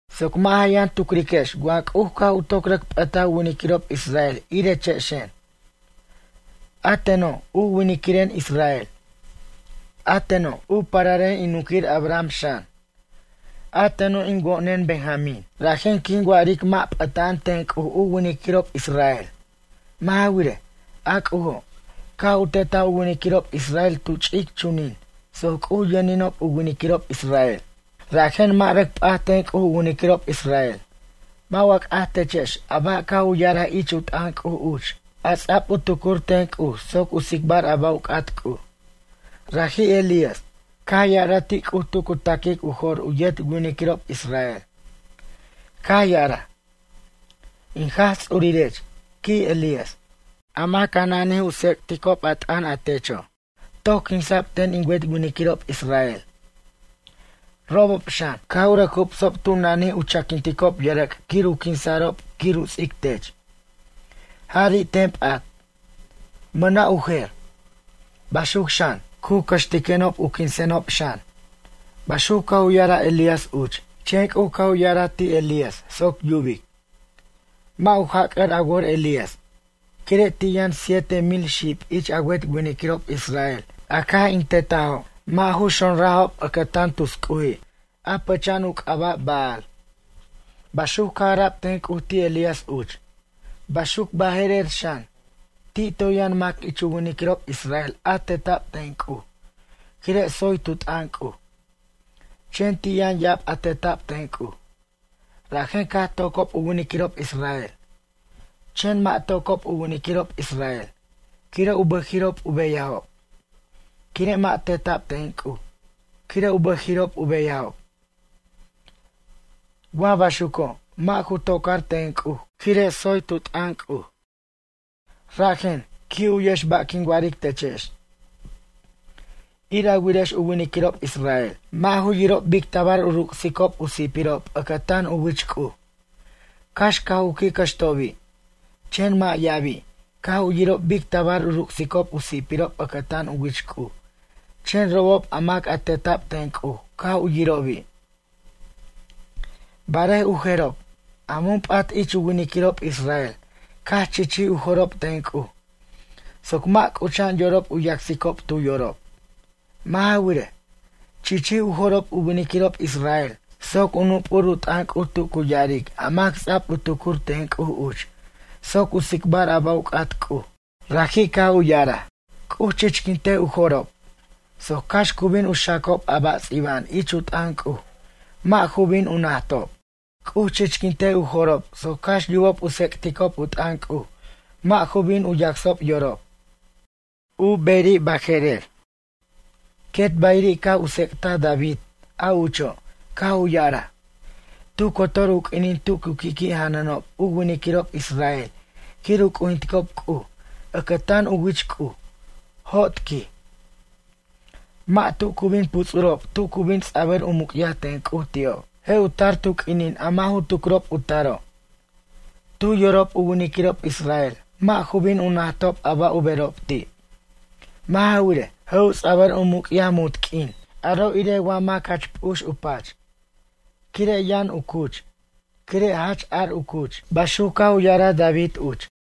Soc mʌ' ja yʌn tucriquex wa C'uj caj u toc rʌc p'ʌtaj u winiquirob israel irechexen. A teno', u winiquiren israel. A teno', u pararen in nunquir Abraham xan. A teno' in wo'nen Benjamín. Rajen quin wa'aric mʌ' p'ʌta'an ten C'uj u winiquirob israel. Mʌ' ja wirej, a C'ujo', caj u tetaj u winiquirob israel tu ch'ic chunin soc C'uj yʌninob u winiquirob israel. Rajen mʌ' rʌc p'at ten C'uj u winiquirob israel. Mʌ' wa c'aj techex a ba' caj u ya'araj ich u t'ʌn C'uj uch, a ts'a'b u tucur ten C'uj soc u tsicbar a ba' u c'at C'uj. Raji' Elías, caj ya'araj ti' C'uj tu cu ta'quic u jo'r u yet winiquirob israel. Caj ya'araj: “In Jaj Ts'urirech, quij Elías, a mac a nanij u tsec'ticob a t'ʌn a techo', toc quinsa'b ten in wet winiquirob israel. Robob xan, caj u rʌc jubsob tu nanij u chaquinticob yʌrʌc' quir u quinsa'rob quir u ts'ic tech. Jari' ten p'at, mʌna' u jer. Baxuc xan, cu cʌxtiquenob u quinsenob xan.” Baxuc caj u ya'araj Elías uch. Chen C'uj caj u ya'araj ti' Elías soc yubic: “Mʌ' ju jac'ʌr a wor Elías, quire' ti' yʌn siete mil xib ich a wet winiquirob israel a caj in tetajo' mʌ' ju xonrajob ʌcʌtan tus c'uji', a pʌcha'an u c'aba' Baal.” Baxuc caj ara'b ten C'uj ti' Elías uch. Baxuc baje'rer xan, ti' toy yʌn mac ich u winiquirob israel a teta'b ten C'uj, quire' tsoy tu t'ʌn C'uj. Chen ti' yʌn ya'ab a teta'b ten C'uj. Rajen caj tocob u winiquirob israel. Chen mʌ' tocob u winiquirob israel, quire' u bʌjiri'ob u beyajob. Quire' mʌ' teta'b ten C'uj, quire' u bʌjiri'ob u beyajob. Wa baxuco', mʌ' ju tocar ten C'uj quire' tsoy tu t'ʌn C'uj. Rajen, qui' u'yex ba' quin wa'aric techex. Ir a wirex u winiquirob israel, mʌ' ju yirob bic tabar u ruc'sicob u si'pirob ʌcʌtan u wich C'uj. Cax caj u qui' cʌxtobi'. Chen mʌ' ya'abi', caj u yirob bic tabar u ruc'sicob u si'pirob ʌcʌtan u wich C'uj, chen robob a mac a teta'b ten C'uj caj u yirobi'. Barej u jerob, a mun p'at ich u winiquirob israel caj chichij u jo'rob ten C'uj soc mʌ' c'ucha'an yorob u yacsicob tu yorob. Mʌ' ja wirej, chichij u jo'rob u winiquirob israel, soc u nup'ur u t'ʌn C'uj tu cu ya'aric a mac ts'a'b u tucur ten C'uj uch, soc u tsicbar a ba' u c'at C'uj. Raji' caj u ya'araj: “C'uj chichquintej u jo'rob, soc cax cu bin u xacob a ba' ts'iba'an ich u t'ʌn C'uj, mʌ' ju bin u najtob. C'uj chichquintej u jo'rob soc cax yubob u tsec'ticob u t'ʌn C'uj, mʌ' ju bin u yacsob yorob.” U beri' baje'rer. Quet bayiri' caj u tsec'taj David, a ucho', caj u ya'araj: Tu cotor u q'uinin tu cu qui'qui' janʌnob u winiquirob israel quir u c'ujinticob C'uj, ʌcʌtan u wich C'uj, jot, quij. Mʌ' tu cu bin puts'urob tu cu bin ts'abʌr u muc'yaj ten C'uj ti'ob. Je' u tar tu q'uinin a mʌ' ju tucrob u taro'. Tu yorob u winiquirob israel, mʌ' ju bin u najtob a ba' u berob ti'. Mʌ' ja wirej, je' u ts'abʌr u muc'yaj munt q'uin, aro' irej wa mac jach p'ux u pach, quire' yʌn u cuch, quire' jach ar u cuch. Baxuc caj u ya'araj David uch.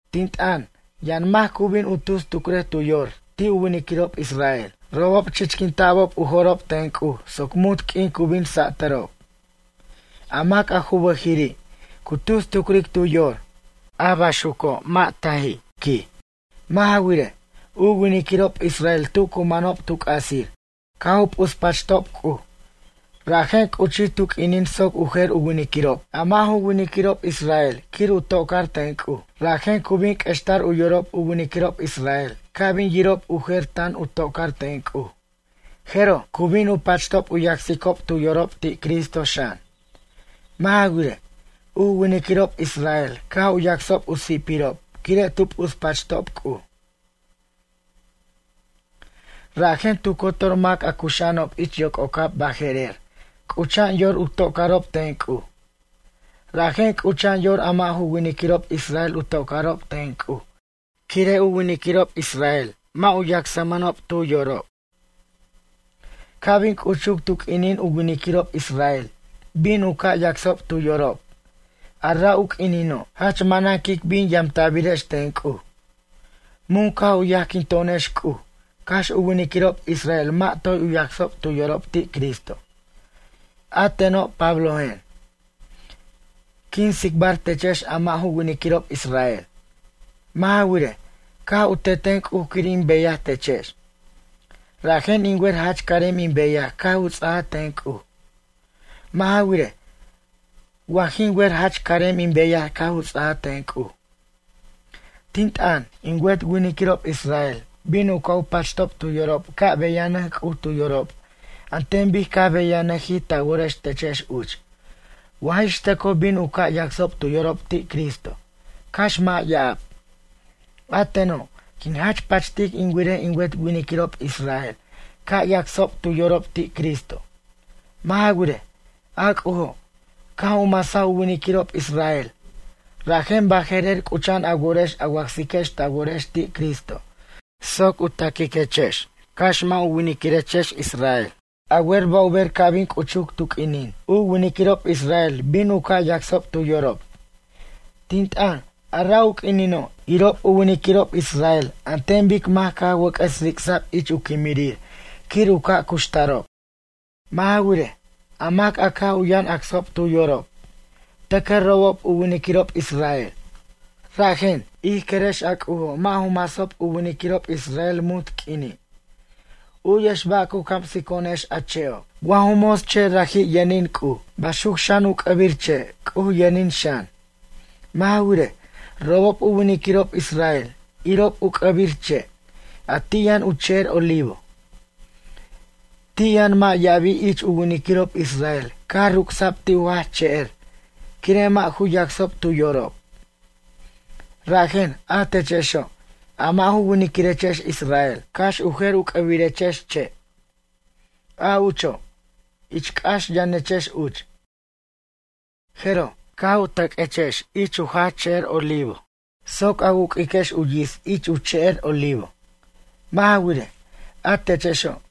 Tin t'ʌn, yʌn mac cu bin u tus tucrej tu yor ti' u winiquirob israel: “Robob chichquinta'b u jo'rob ten C'uj soc munt q'uin cu bin satʌrob.” A mac a ju bʌjiri', cu tus tucric tu yor, a baxuco' mʌ' taji', quij. Mʌ' ja wirej, u winiquirob israel tu cu manob tu c'asir, caj u p'uspachob C'uj. Rajen c'uchij tu q'uinin soc u jer winiquirob, a mʌ' ju winiquirob israel quir u tocar ten C'uj. Rajen cu bin q'uextar u yorob u winiquirob israel ca' bin yirob u jer tan u toc'ar ten C'uj. Jeroj, cu bin u pachtob u yacsicob tu yorob ti' Cristo xan. Mʌ' ja wirej, u winiquirob israel caj u yacsob u si'pirob quire' tu p'uspachtob C'uj, rajen tu cotor mac a cuxa'anob ich yoc'ocab baje'rer c'ucha'an yor u tocarob ten C'uj. Rajen c'ucha'an yor a mʌ' ju winiquirob israel u tocarob ten C'uj quire' u winiquirob israel mʌ' ju yacsmʌnob tu yorob. Ca' bin c'uchuc tu q'uinin u winiquirob israel bin u ca' yacsob tu yorob, a ra' u q'uinino', jach manan quic bin yamta'birex ten C'uj. Mun caj u yajquinto'onex C'uj, cax u winiquirob israel mʌ' toy u yacsob tu yorob ti' Cristo. A teno' Pablojen, quin tsicbar techex a mʌ' ju winiquirob israel. Mʌ' ja wirej, caj u teten C'uj quir in beyaj techex. Rajen in wer jach carem in beyaj caj u ts'aj ten C'uj. Mʌ' ja wirej, wa jin wer jach carem in beyaj caj u ts'aj ten C'uj. Tin t'ʌn, in wet winiquirob israel bin u ca' u pachtob tu yorob ca' beyanʌc C'uj tu yorob an ten bic caj beyanʌjij ta worex techex uch, wa jix tʌcoj bin u ca' yacsob tu yorob ti' Cristo, cax mʌ' ya'ab. A teno', quin jach pachtic in wirej in wet winiquirob israel ca' yacsob tu yorob ti' Cristo. Mʌ' ja wirej, a C'ujo', caj u masaj u winiquirob israel, rajen baje'rer c'ucha'an a worex a wacsiquex ta worex ti' Cristo, soc u taquiquechex cax mʌ' ju winiquirex israel. A wer ba' u ber ca' bin c'uchuc tu q'uinin, u winiquirob israel bin u ca' yacsob tu yorob? Tin t'ʌn, a ra' u q'uinino', irob u winiquirob israel an ten bic mac caj wʌc'ʌs ric'sa'b ich u quimirir quir u ca' cuxtarob. Mʌ' ja wirej, a mac caj u yʌn acsob tu yorob, tʌcʌ robob u winiquirob israel. Rajen, ij querex a C'ujo' mʌ' ju masob u winiquirob israel munt q'uini'. U'yex ba' cu camsico'onex a che'o'. Wa ju mos che' raji' yʌnin C'uj, baxuc xan u c'ʌbir che', C'uj yʌnin xan. Mʌ' ja wirej, robob u winiquirob israel, irob u c'ʌbir che', a ti' yʌn u che'er olivo. Ti' yʌn mʌ' ya'abi' ich u winiquirob israel caj ruc'sa'b ti' u jach che'er, quire' mʌ' ju yacsob tu yorob. Rajen, a techexo', a mʌ' ju winiquirechex israel, cax u jer u c'ʌbirechex che'. A ucho', ich c'ax yʌnechex uch. Jeroj, caj u tʌq'uechex ich u jach che'er olivo soc a wuq'uiquex u yits ich u che'er olivo. Mʌ' ja wirej, a techexo',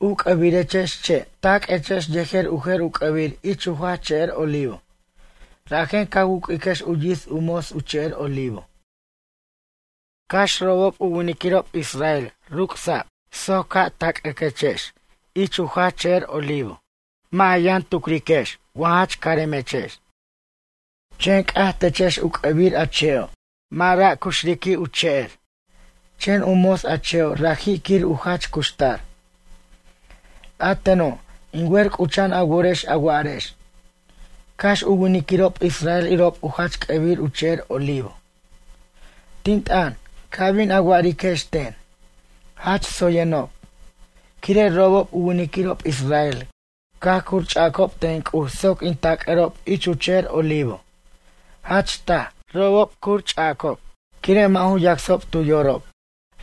u c'ʌbirechex che' taq'uechex yejer u jer u c'ʌbir ich u jach che'er olivo. Rajen ca wuq'uiquex u yits u mos u che'er olivo. Cax robob u winiquirob israel ruc'sa'b soc ca' tac'ʌquechex ich u jach che'er olivo. Mʌ' ja yʌn tucriquex wa jach caremechex. Chen c'aj techex u c'ʌbir a che'o', mʌ' ra' cuxriq'uij u che'er. Chen u mos a che'o' raji' quir u jach cuxtar. A teno', in wer c'ucha'an a worex a wa'arex: “Cax u winiquirob israel irob u jach c'ʌbir u che'er olivo.” Tin t'ʌn, ca bin a wa'ariquex ten: “Jach tsoyenob,” quire' robob u winiquirob israel caj curch'acob ten C'uj soc in tac'ʌrob ich u che'er olivo. Jach taj, robob cuch'acob, quire' mʌ' ju yacsob tu yorob,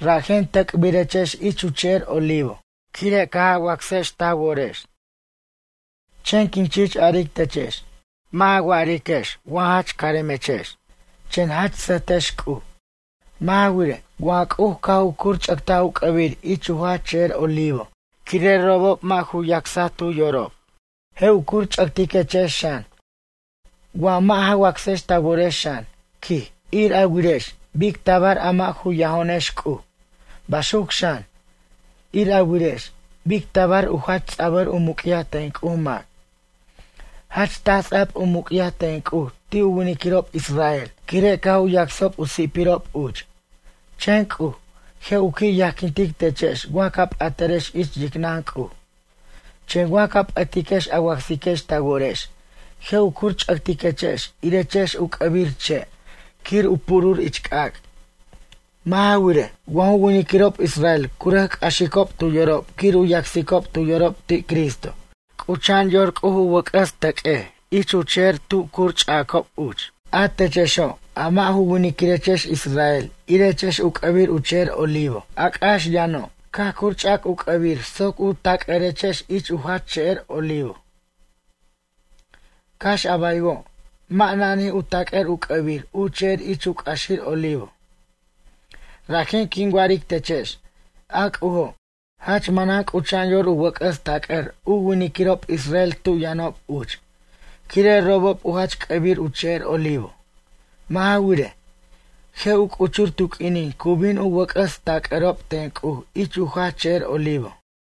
rajen tʌc'birechex ich u che'er olivo, quire' caj a wacsex ta worex. Chen quin chich aric techex, mʌ' ja wa'ariquex wa jach caremechex, chen jach sʌjtex C'uj. Mʌ' ja wirej, wa C'uj caj u cuch'ʌtaj u c'ʌbir ich u jach che'er olivo, quire' robob mʌ' ju yacsob tu yorob, je' u curch'ʌtiquechex xan, wa mʌ' ja wacsex ta worex xan, quij. Ir a wirex, bic tabar a mʌ' ju yajo'onex C'uj. Baxuc xan, ir a wirex, bic tabar u jach ts'a'bʌr u muc'yaj ten C'uj mac. Jach taj ts'a'b u muc'yaj ten C'uj ti' u winiquirob israel, quire' caj u yacsob u si'pirob uch. Chen C'uj, je' u qui' yajquintic techex wa ca p'atarex ich yicnʌn C'uj. Chen wa ca p'ʌtiquex a wacsiquex ta worex, je' u curch'ʌtiquechex irechex u c'ʌbir che' quir u purur ich c'ac'. Mʌ' ja wirej, wa ju winiquirob israel cu rʌc c'axicob tu yorob quir u yacsicob tu yorob ti' Cristo, c'ucha'an yor C'uj u wʌc'ʌs tʌq'uej ich u che'er tu curch'acob uch. A techexo', a mʌ' ju winiquirechex israel irechex u c'ʌbir u che'er olivo, a c'ax yʌno'. Caj curch'ac u c'ʌbir soc u tac'ʌrechex ich u jach che'er olivo. Cax a baywo', mʌ' nanij u tac'ʌr u c'ʌbir u che'er ich c'axir olivo. Rajen quin wa'aric techex, a C'ujo', jach manan c'ucha'an yor u wʌc'ʌs tac'ʌr u winiquirob israel tu yʌnob uch, quire' robob u jach c'ʌbir u che'er olivo. Mʌ' ja wirej, je' u c'uchur tu q'uinin cu bin u wʌc'ʌs tac'ʌrob ten C'uj ich u jach che'er olivo.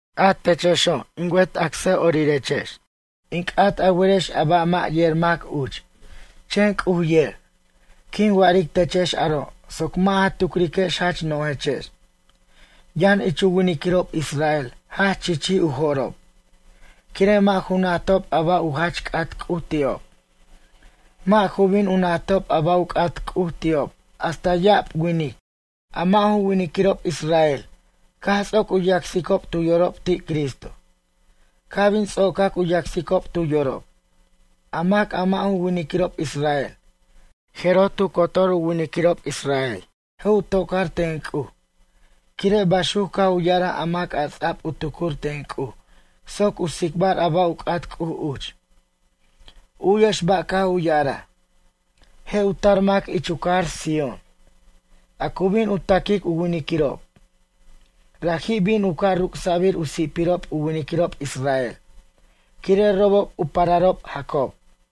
A techexo', in wet acsa'orex, in c'at a werex a ba' mʌ' yer mac uch, chen C'uj yer. Quin wa'aric techex aro' soc mʌ' ja tucriquex jach no'jechex. Yʌn ich u winiquirob israel jach chichij u jo'rob, quire' mʌ' ju najtob a ba' u jach c'at C'uj ti'ob. Mʌ' ju bin u najtob a ba' u c'at C'uj ti'ob hasta ya'ab winic, a mʌ' ju winiquirob israel, caj ts'oc u yacsicob tu yorob ti' Cristo. Ca' bin ts'ocac u yacsicob tu yorob, a mac a mʌ' ju winiquirob israel, jeroj tu cotor u winiquirob israel je' u tocar ten C'uj, quire' baxuc caj u ya'araj a mac a ts'a'b u tucur ten C'uj soc u tsicbar a ba' u c'at C'uj uch. U'yex ba' caj u ya'araj: Je' u tar mac ich u cajar Sión, a cu bin u taquic u winiquirob. Raji' bin u ca' ruc'sa'bir u si'pirob u winiquirob israel, quire' robob u pararob Jacob.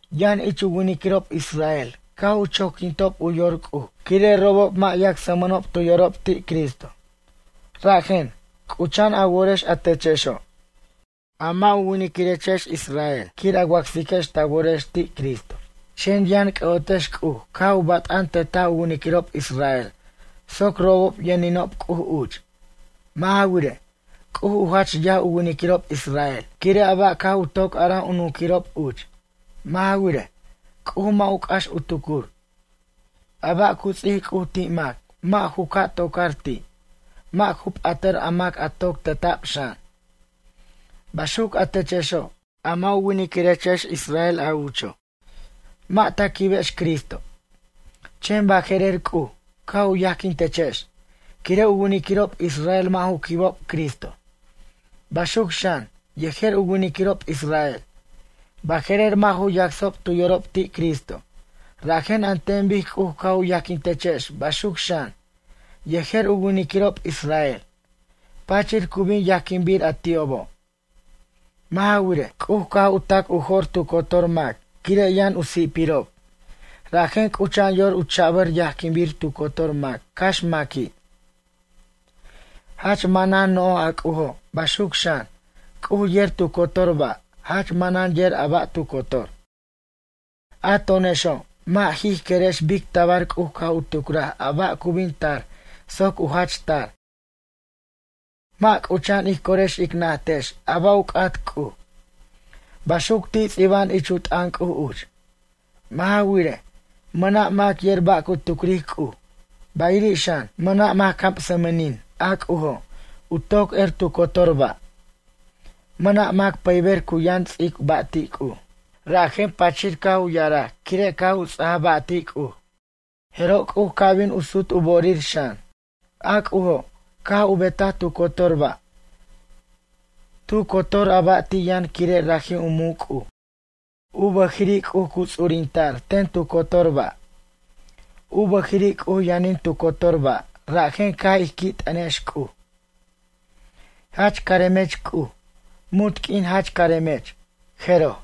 Yʌn ich u winiquirob israel caj u choquintob u yor C'uj, quire' robob mʌ' yacsmʌnob tu yorob ti' Cristo. Rajen, c'ucha'an a worex a techexo', a mʌ' ju winiquirechex israel quir a wacsiquex ta worex ti' Cristo. Chen yʌn c'ʌ'otex C'uj caj u bat'an tetaj u winiquirob israel soc robob yʌninob C'uj uch. Mʌ' ja wirej, C'uj u jach yaj u winiquirob israel, quire' a ba' caj u toc araj u nunquirob uch. Mʌ' ja wirej, C'uj mʌ' u c'ax u tucur. A ba' cu ts'ic C'uj ti' mac, mʌ' ju ca' tocar ti', mʌ' ju p'ʌtʌr a mac a toc teta'b xan. Baxuc a techexo', a mʌ' ju winiquirechex israel a ucho', mʌ' ta quibex Cristo. Chen baje'rer C'uj, caj u yajquintechex, quire' u winiquirob israel mʌ' ju quibob Cristo. Baxuc xan, yejer u winiquirob israel, baje'rer mʌ' ju yacsob tu yorob ti' Cristo, rajen an ten bic C'uj caj u yajquintechex baxuc xan, yejer u winiquirob israel, pachir cu bin yajquinbir a ti'obo'. Mʌ' ja wirej, C'uj caj u tac u jo'r tu cotor mac, quire' yʌn u si'pirob, rajen c'ucha'an yor u cha'bʌr yajquinbir tu cotor mac cax maqui'. Jach manan no'j a C'ujo', baxuc xan, C'uj yer tu cotor ba', jach manan yer a ba' tu cotor. A to'onexo', mʌ' jij querex bic tabar C'uj caj u tucraj ba' a cu bin tar soc u jach tar. Mʌ' c'ucha'an ij corex ic najtex ba' u c'at C'uj. Baxuc ti' ts'iba'an ich u t'ʌn C'uj uch: Mʌ' ja wirej, mʌna' mac yer ba' cu tucric C'uj, bayiri' xan, mʌna' mac camsʌmʌnin, a C'ujo', u toc er tu cotor ba'. Mʌna' mac pʌyber cu yʌn ts'ic ba' ti' C'uj. Rajen pachir caj u ya'araj quire' caj u ts'aja ba' ti' C'uj, jeroj C'uj ca' bin u sut u bo'orir xan. A C'ujo', caj u betaj tu cotor ba'. Tu cotor a ba' ti' yʌn quire' raji' u muc' C'uj. U bʌjiri' C'uj cu ts'urinta'r ten tu cotor ba'. U bʌjiri' C'uj yʌnin tu cotor ba', rajen ca' ij qui' t'ʌnex C'uj: “Jach caremech C'uj, munt q'uin jach caremech.” Jeroj.